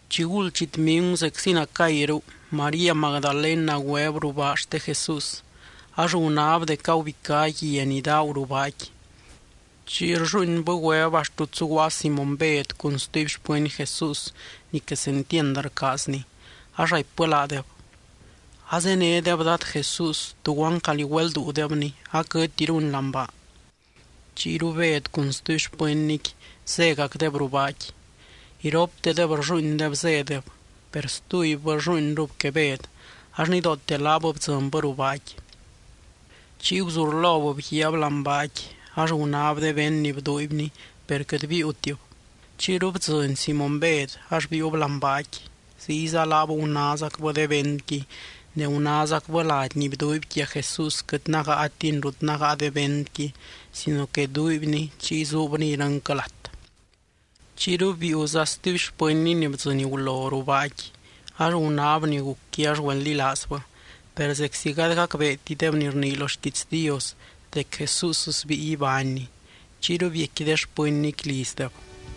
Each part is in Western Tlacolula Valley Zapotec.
Chiguld chitmingu zeczi nacayru, María Magdalena güeb ruu baa xte Jesús. Ax gunáb dec agubicá guia ni daagu ruu baaqui. Chiy rlluuinbɨ güeb axt rut zuguaa Simóny Bed cun stuby xpɨny Jesús ni quesentiand rcaazny, ax raipbɨ laadeb: —Azénedeb Dad Jesús, tuguan calí güelduudebny aquɨtiruny láani baa. Chiyru Bed cun stuby xpɨnnyqui zégacdeb ruu baaqui. Iroptedeb rlluuindeb zédeb, per stubybɨ rlluuinrub que Bed ax nidoote laab bdzɨnbɨ ruu baaqui. Chiy guzurlob bguiaab láani baaqui, ax gunáb de vend ni bduuibny, per quɨt biiutib. Chiyru bdzɨny Simóny Bed, ax biiub láani baaqui. Ziyza laab gunázacbɨ de vendqui. Ne gunázacbɨ lady ni bduuiby quia Jesús quɨt nágaatini rut nágaa de vendqui sino que duuibni chiy zuubni irɨnquɨ lat. Chiyru biiuza stuby xpɨnny ni bdzɨny gulo ruu baaqui, ax gunáb ni gucqui ax güeldilaazbɨ. Per zeczi gady gacbeetideb ni rnii lo xquiits Dios dec Jesús sbíi ibánny, chiyru biecqui de xpɨnnyqui lizdeb.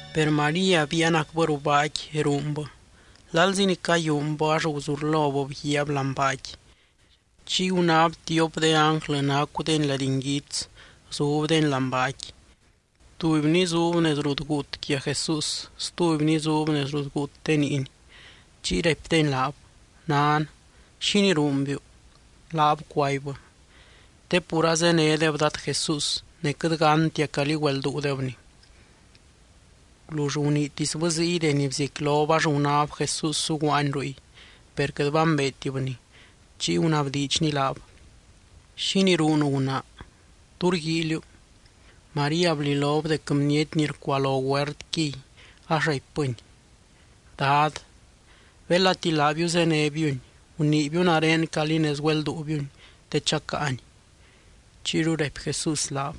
Per María biianacbɨ ruu baaqui ruunbɨ. Lalzi ni cayúunbɨ, ax guzurlob bguiaab láani baaqui. Chiy gunáb tiop de ánglɨ nacudeny lady nguits, zubdeny láani baaqui. Tubyny zub nez rut guut quia Jesús, stubyny zub nez rut guut de niiny. Chiy raipdeny laab: —Nan, ¿xínii ruunbiu? Laab cuaibbɨ: —Te pur azénedeb Dad Jesús, ne quɨt gántia calí güelduudebny. Gulull guniitisbɨ ziy deni bziecquilob ax gunáb Jesús zuguaany ruy. Per quɨt bambeetibny. Chiy gunabdiidxny laab: —¿Xínii ruunu, gunaa? ¿Tú rguíiliu? María blilob dec bniety ni rcualo huertquiy, ax raipbɨny: —Dad, belati laabiu zénebiuny, guniibiu nare calí nez güelduubiuny te chacáany. Chiyru raipy Jesús laab: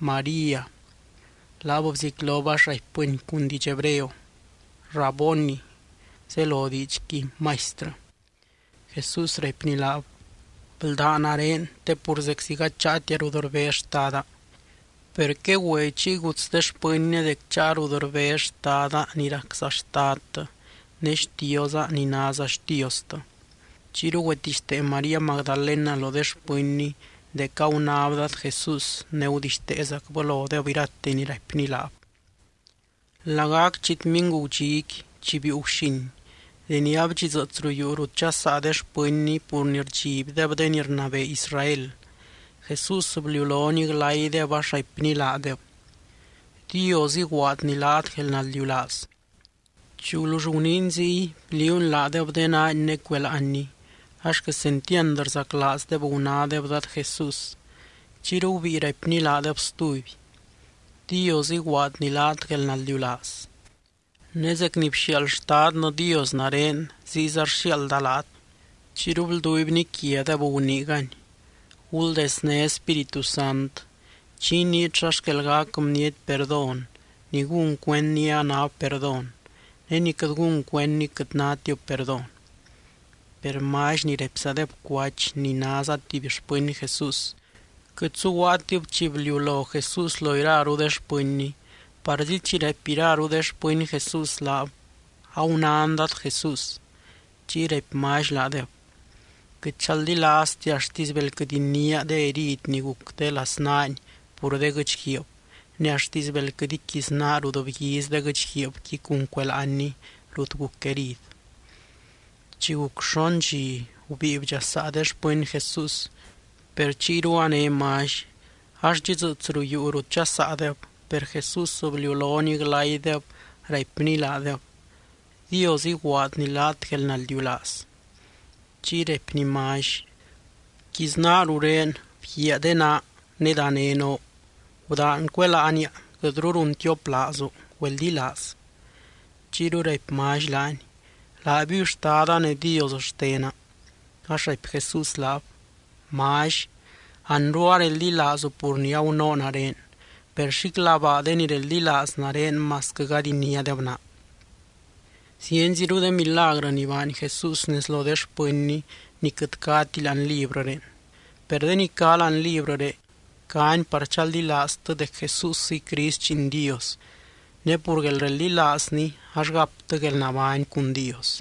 —¡María! Laab bziecquilob ax raipbɨny cun diidx hebreo: —¡Raboni! (zelo diidxqui, Maistrɨ). Jesús raipny laab: —Bldá nare, te pur zeczi gady cháatia rut rbez Xtada. Per quegüe chiy guts de xpɨnnia dec cháa rut rbez Xtada ni racza Xtadtɨ, ne Xtioza ni náza Xtiostɨ. Chiyru güetixtee María Magdalena lo de xpɨnny dec agunáb Dad Jesús ne gudixteezacbɨ lodeb irate ni raipny laab. Lagac chitmingu gudxiqui, chi biiu guxin, deni adxidzɨɨts ruu yuu rut dxasaa de xpɨnny pur ni rdxibdeb de ni rnabee Israel, Jesús bliulony glaydeb, ax raipny laadeb: —Dios iguaadny laat guelnaldiulaaz. Chi gulull guniiny ziy, bliuuny laadeb de naany ne cueláanny. Ax quesentiand rzaclaazdeb gunádeb Dad Jesús. Chiyru gubíi raipny laadeb stuby: —Dios iguaadny laat guelnaldiulaaz. Ne zec ni bxiaald Xtadnɨ Dios nare, ziyza rxiaalda laat. Chiyru blduibny quiadeb, guniigany: —Guldezné Spíritu Sant. Chi iniit xa xquel gac bniety perdón, ni gún cuendni anáb perdón. Ne ni quɨt gún cuendni quɨt nátib perdón. Per Mally, ni raipzadeb Cuach ni náza tuby xpɨny Jesús, quɨt zuguaatib chi bliulo Jesús lo iraru de xpɨnny. Parzi chi raipy iraru de xpɨny Jesús laab: —Agunán Dad Jesús. Chiy raipy Mally laadeb: —Quɨt chaldilaaztia axtisy bel quɨt iniáa de herid ni guc de laznaany pur de guɨ́chguiib, ne axtisy bel quɨt iquiznaa rut bguiz de guɨ́chguiibqui cun cueláanny rut guc herid. Chi guc xon dxi, gubíi bdxasaa de xpɨny Jesús, per chiyru a né Mally. Ax dxidzɨɨts ruu yuu rut dxasaadeb, per Jesús bliulony glaydeb, raipny laadeb: —Dios iguaadny laat guelnaldiulaaz. Chiy raipny Mally: —Bquiznaa rurén, bguiaa de naa. Ne dané noo, gudaan cueláania. Quɨtru runtioplaazu, güeldilaaz. Chiyru raipy Mally laany: —¡Laabiuy Xtada ne Dios xtena! Ax raipy Jesús laab: —Mally, anru areldilaazu pur ni agunoo nare. Per xíclabaa de ni reldilaaz nare, masquɨ gady iniádeb naa. Zienziru de milagrɨ ni baany Jesús nez lo de xpɨnny ni quɨt cáti láani librɨré. Per de ni cá láani librɨré, cáni par chaldilaaztɨ dec Jesúsiy Crist Lliin Dios, ne pur guelreldilaazny ax gaptɨ guelnabány cun Dios.